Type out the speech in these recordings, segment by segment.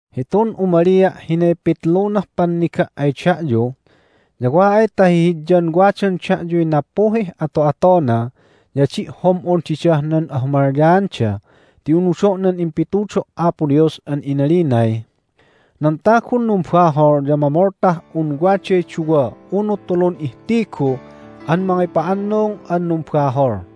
Hitun umalia' hinay pitlunah panniga' ay da'yu, ya wa ay ta hihidyan wadan da'yuy nappuhih ato'atona ya adi' hom'on didah nan ahumalyaanda ti unudo' nan impitudo' Apo Dios an inalinay, "Nan tagun numbahol ya mamoltah un waday duwa unu tulun ihtigu an mangipa'annung an numbahol."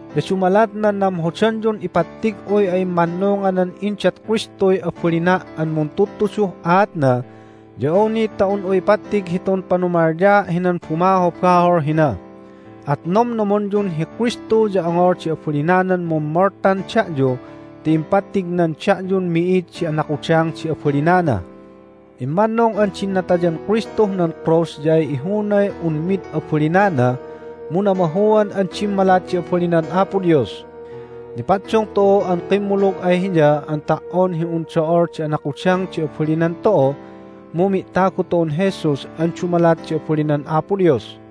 Ya dumalat nan namhodanyun ipattig'uy a'immannunganan indat Kristuy abalina' an muntudtuduh aatna ya awni ta un'u ipattig hitun panumalyaa' hinan bumahobahol hina. At nomnomonyun hi Kristu ya ongol di abalinanan mummoltan da'yu ti impattignan da'yun mi'id di anakudang di abalinana. Immannung an din natayan Kristuh nan krus ya ay ihunay un mid abalinana, mu namahuan an dimmalat di abalinan Apo Dios. Nipaddung tu'u an kimmulug ay Hiya an ta"on hi un do'ol di anakudang di abalinan tu'u, mu mi'tagu tu'un Jesus an dumalat di abalinan Apo Dios.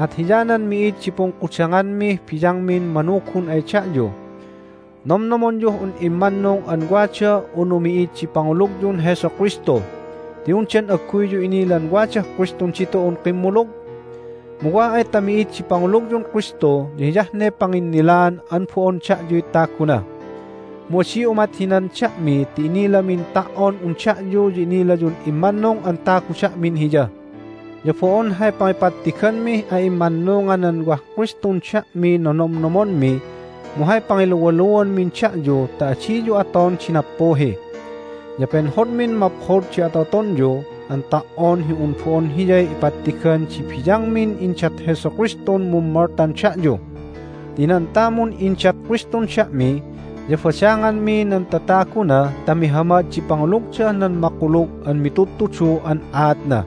At hiyanan mi'id di pungkudanganmih biyangmin manugun ay da'yu. Nomnomonyuh un immannung an wada unu mi'id di pangulugyun Jesu Kristu. Ti undan agguyyu inilan wadah Kristun ditu'un kimmulug? Mu wa ay ta mi'id di pangulugyun Kristu ya hiyah ne panginnilaan an bo'on da'yuy taguna. Mu adi umat hinan da'mi ti inilamin ta"on un da'yu ya inilayun immannung an tagu da'min Hiya. Ya bo'on hay pangipattiganmih a'immannunganan wah Kristun da'miy nonomnomonmi, mu hay pangiluwaluanmin da'yu ta adiyu aton di nappuhi. Ya penhodmin maphod di ato'atonyu an ta"on hi un bo'on hiyay ipattigan di biyangmin indat Jesu Kristun mummoltan da'yu. Ti nan tamun indat Kristun da'mi ya badanganmi nan tataguna ta mihamad di pangulugdah nan makulug an mitudtudu an aatna.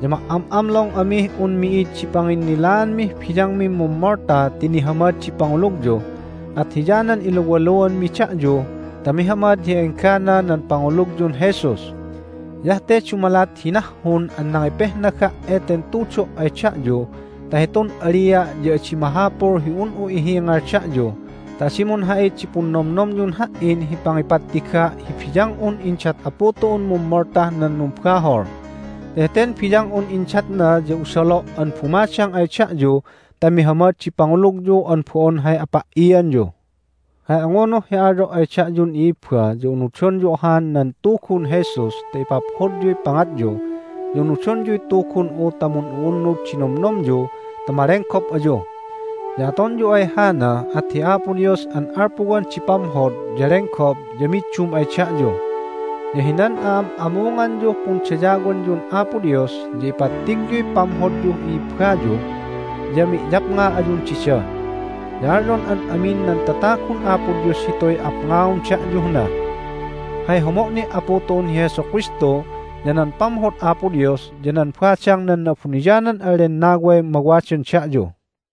Ya ma"am'amlong amih un mi'id di panginnilaanmih biyangmin mummolta ti nihamad di pangulugyu, at hiyanan iluwaluanmi da'yu ta mihamad hi enggana nan pangulugyun Jesus. Hiyah te dumalat hi nahhun an nangipehnaga' eten tudo' ay da'yu ta hitun alia' ya adi mahapul hi un'u ihingal da'yu ta adi munha'it di punnomnomyun ha"in hi pangipattiga' hi biyang'un indat Apu tu'un mummoltah nan numbahol. Ti heten biyang'un indatna ya usalo' an bumadang ay da'yu ta mihamad di pangulugyu an bo'on hay apa"ianyu. Hay angunuh hi alyo' ay da'yun i'ibba ya unudonyu ahan nan Tugun Jesus ta ipaphodyuy pangatyu, ya unudonyuy tugun'u ta mun'u'unnud di nomnomyu ta malenggop ayu. Ya atonyu ay hana at hi Apo Dios an alpuwan di pamhod ya lenggop ya middum ay da'yu. Ya hinan a'am'amunganyuh pundayawanyun Apo Dios ya ipattigyuy pamhodyuh i'ibbayu, ya mi'yapnga ayun dida. Ya alyon an amin nan tatagun Apo Dios hituy apngaon da'yuh na. Hay homo' ni' Apu tu'un hi Jesu Kristu, ya nan pamhod Apo Dios, ya nan badang nan Na'abuniyanan an Lennaway mawadan da'yu.